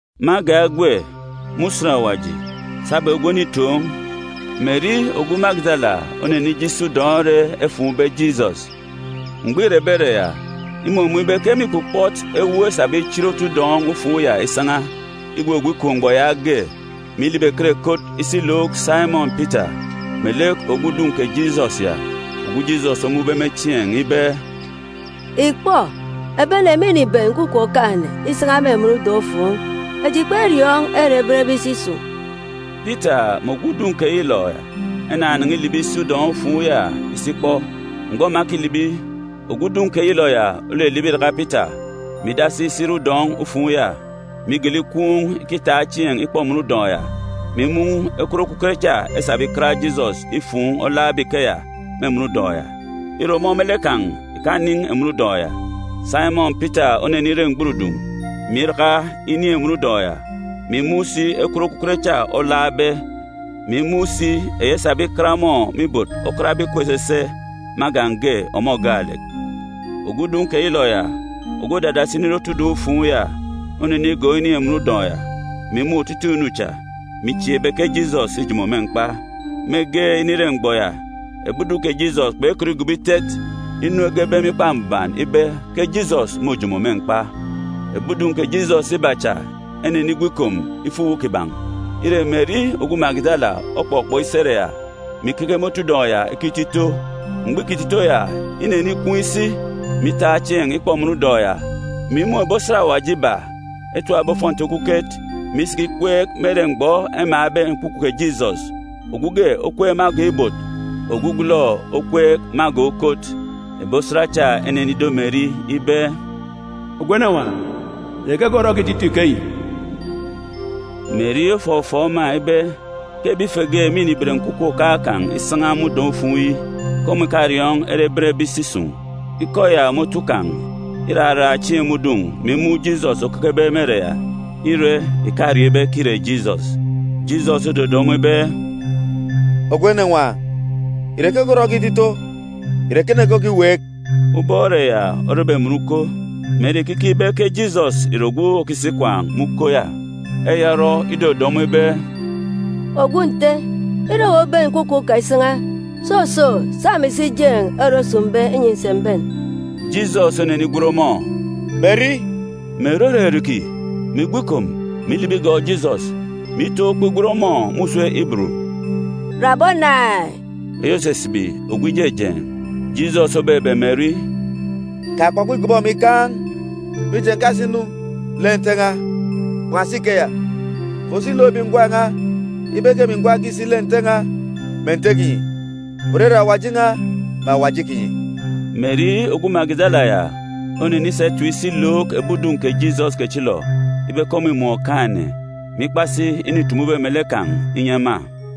Me agan̄ egwe, me usen ògọọk Usen Mbuban, sabum egwe onitoon̄, Meri ogwu Magidala onenije isi udọn̄ ere efuun̄be Jisọs. Mgbọ îrebe ere ya, imumun̄ ibe ke mîkpukpọt ewuuk esabe ichit otu udọn̄-ufuun̄ ya isan̄a. Igwugwu ikom mgbọ yaage, mè ilibi ekot ekot isi ilook Saimọn Pita melek ogwu udun̄ kè Jisọs ya, ogwu Jisọs omun̄be me chieen̄, ibe, “Ìkpọ, ebi ene mîniben nkwukwu Okaan̄-ene isan̄a me emen udọn̄-ufuun̄. Eji kperiọọn̄ ere ebenbe isi isun̄.” Pita mè ogwu udun̄ keyilọ ya enanan̄a ilibi isi udọn̄-ufuun̄ ya isi ikpọ. Mgbọ ema ekilibi, ogwu udun̄ keyilọ ya olilibi iraka Pita, mè idasi isi ire udọn̄-ufuun̄ ya, mè igele ikwuun̄ ikitaak chieen̄ ikpọ emen udọn̄ ya, mè imun̄ ekwut okuket cha esabe ikat Jisọs ifuun̄ olaakbe ikeya me emen udọn̄ ya. Ire, ọmọ me lek kan̄ ìkanin̄ emen udọn̄ ya. Saimọn Pita onenire mgburudun̄, mè iraka inin̄ emen udọn̄ ya, mè imun̄ si ekwut okuket cha olaakbe, mè imun̄ si eyi esabe ikat ọmọ me ibot okatbe ikup esese me agan̄ ge, ọmọ gaalek. Ogwu udun̄ keyilọ ya, ogwu òdadasi inire otu udọn̄-ufuun̄ ya, onenigọọk inin̄ emen udọn̄ ya, mè imun̄ otutuuk inu cha, mè ichieek ibe ke Jisọs îjomo me mkpa. Mege inire mgbọ ya, ebi udun̄ kè Jisọs kpekọt igobo itet inu egebe me Ikpa Mbuban ibe ke Jisọs môjomo me mkpa. Ebi udun̄ kè Jisọs iba cha enenigwu ikom ifo uwu kiban̄. Ire, Meri ogwu Magidala okpọkpọk isi ere ya, mè ikeke me otu udọn̄ ya ikito ito. Mgbọ îkito ito ya, inenikwuun̄ isi, mè itaak chieen̄ ikpọ emen udọn̄ ya, mè imun̄ ebi osat Awaji iba, etapbe ofọnti okuket, mè isiki ikweek me ere mgbọ emaan̄be nkwukwu kè Jisọs, ogwu ge okweek me agan̄ ibot, ogwugwulọ okweek me agan̄ ukot. Ebi osat cha enenido Meri ibe, “Ogwu enenwaan̄, ìre keke orọ okito ito ikeyi?” Meri ofọfọọk ema ibe ke ebi ife ge mîniben nkwukwu Okaan̄ kan̄ isan̄a me udọn̄-ufuun̄ yi; ke ọmọ ìkariọọn̄ ere ebenbe isi isun̄. Ikọ ya me otu kan̄, iraraan̄ chieen̄ me udun̄, mè imun̄ Jisọs okekebe me ere ya. Ire, ìkariọọn̄ ibe ke îre Jisọs. Jisọs ododo ọmọ ibe, “Ogwu enenwaan̄, ìre keke orọ okito ito? Ìre ekene ke okiweek?” Ubọk ere ya orebe emen uko, Meri ìkikeek ibe ke Jisọs ìre ogwu òkisi ikwaan̄ me uko ya. Eya orọ, idodo ọmọ ibe, “Ogwu nte, ire owu oben nkwukwu kan̄ isan̄a, soso, sa emi si jeen̄ ere osun̄be, inyi ǹsi m̀ben.” Jisọs onenigwen ọmọ “Meri!” Meri oririki, mè igwu ikom, mè ilibi igọọk Jisọs, mè itaan̄ ukpo igwen ọmọ me usem Iburu, “Raboni!” (eyi òsisibi Ogwu Ijejeen̄). Jisọs obebe Meri, “Kakpọkpọ ìgọbọ emi ìkaan̄, mije, ǹkasi-nu lek Nte n̄a. Kpan̄asi ikeya, fo si look ebi ngwan̄ n̄a ibe ke emi gwa ǹkisi lek Nte n̄a, mè Nte kinyi, òrere Awaji n̄a, mè Awaji kinyi.” Meri ogwu Magidala ya onenisa etip isi ilook ebi udun̄ kè Jisọs kechilọ ibe ke ọmọ îmun̄ Okaan̄-ene, mè ikpa si inu îtumube melek kan̄ inyi ema.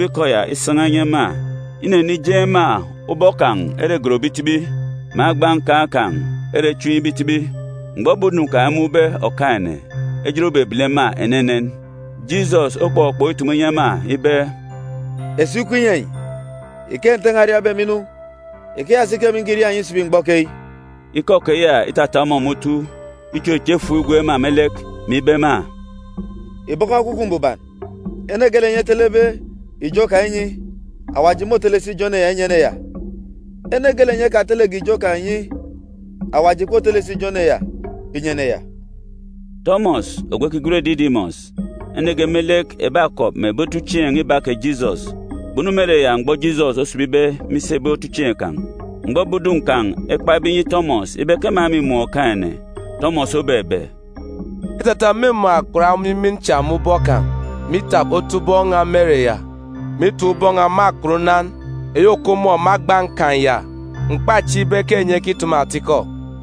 Mgbọ îtumube ikọ ya isan̄a inyi ema, inenijeen̄ ema ubọk kan̄ ere egonbe itibi, mè agba nkan̄ kan̄ ere echimbe itibi. Mgbọ ebi udun̄ kan̄ emun̄be Okaan̄-ene, ejit obebele ema enenen. Jisọs okpọkpọk itumu inyi ema ibe, “Esuuk ikup inyi enyi! Ike Nte n̄a oriabe emi inu, ikeya si ke emi nkiria enyi isibi mgbọ keyi.” Ikọ keya itata ọmọ me otu, ichocho efuuk igwook ema me lek, mè ibe ema, “Ìbọkọ Ekwukwu Mbuban. Ene geelek enyi etelebe ijo kan̄ inyi, Awaji môtele si ijo ene ya inyi ene ya. Ene geelek enyi kpetele ijo kan̄ inyi, Awaji ìkpotele si ijo ene ya inyi ene ya.” Tọmọs ogwu ekigwen Didimọs, ene ge me lek ebi akọp mè ebi otuchieen̄ iba kè Jisọs, kpunu me ere ya mgbọ Jisọs osibibe me isi ebi otuchieen̄ kan̄. Mgbọ ebi udun̄ kan̄ ekpabe inyi Tọmọs ibe ke ema mîmun̄ Okaan̄-ene, Tọmọs obebe, “Îtata m̀mumun̄ akpat omimin cha me ubọk kan̄, mè itap otubọk n̄a me ere ya, mè itap ubọk n̄a me akpat unan eyi òkup ọmọ me agba nkan̄ ya, m̀kpachieek ibe ke enyi ekitumu atikọ.”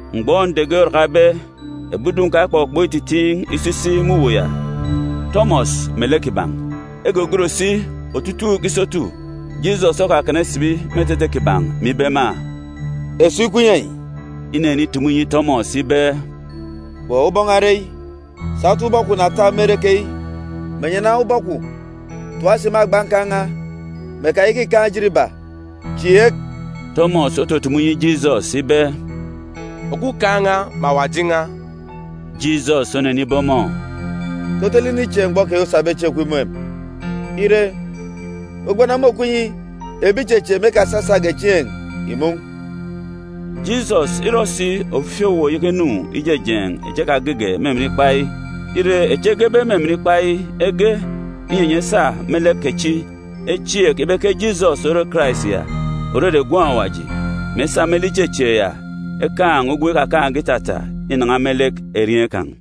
Mgbọ nde ge orakabe, ebi udun̄ kan̄ ekpọkpọk ititiin̄ iso isi me uwu ya, Tọmọs melek kiban̄. Egogon si otutuuk isotu. Jisọs okakana isibi me etete kiban̄, mè ibe ema, “Esuuk ikup inyi enyi!” Inenitumu inyi Tọmọs ibe, “Kpọ ubọk n̄a ire eyi. Sa otubọk kwun̄ na tap me ere keyi, mè nyana ubọk kwun̄ tap si me agba nkan̄ n̄a, mè kayaka ìkaan̄ ejit iba. Chieek!” Tọmọs otutumu inyi Jisọs ibe, “Ogwukaan̄ n̄a mè Awaji n̄a!” Jisọs onenibe ọmọ, “Ke otolek inichieek mgbọ keyi osabe chieen̄ kwun̄ imun̄ emi? Ire, uga ubelejit okup inyi ebi ìchechieek me ekasasage chieen̄ ìmun̄.” Jisọs îrọ si ofifi owuwa uyeke inu ijejeen̄ echi ekagege me emen ikpa yi. Ire, echi egebe me emen ikpa yi, ege, inyi enyi esa me lek kechi echieek ibe ke Jisọs ore Karais ya, òrere Gwun̄ Awaji, mè esa me lek ichechieek ya ekaan̄ ugwem ikakaan̄ge itata inan̄a me lek erieen̄ kan̄.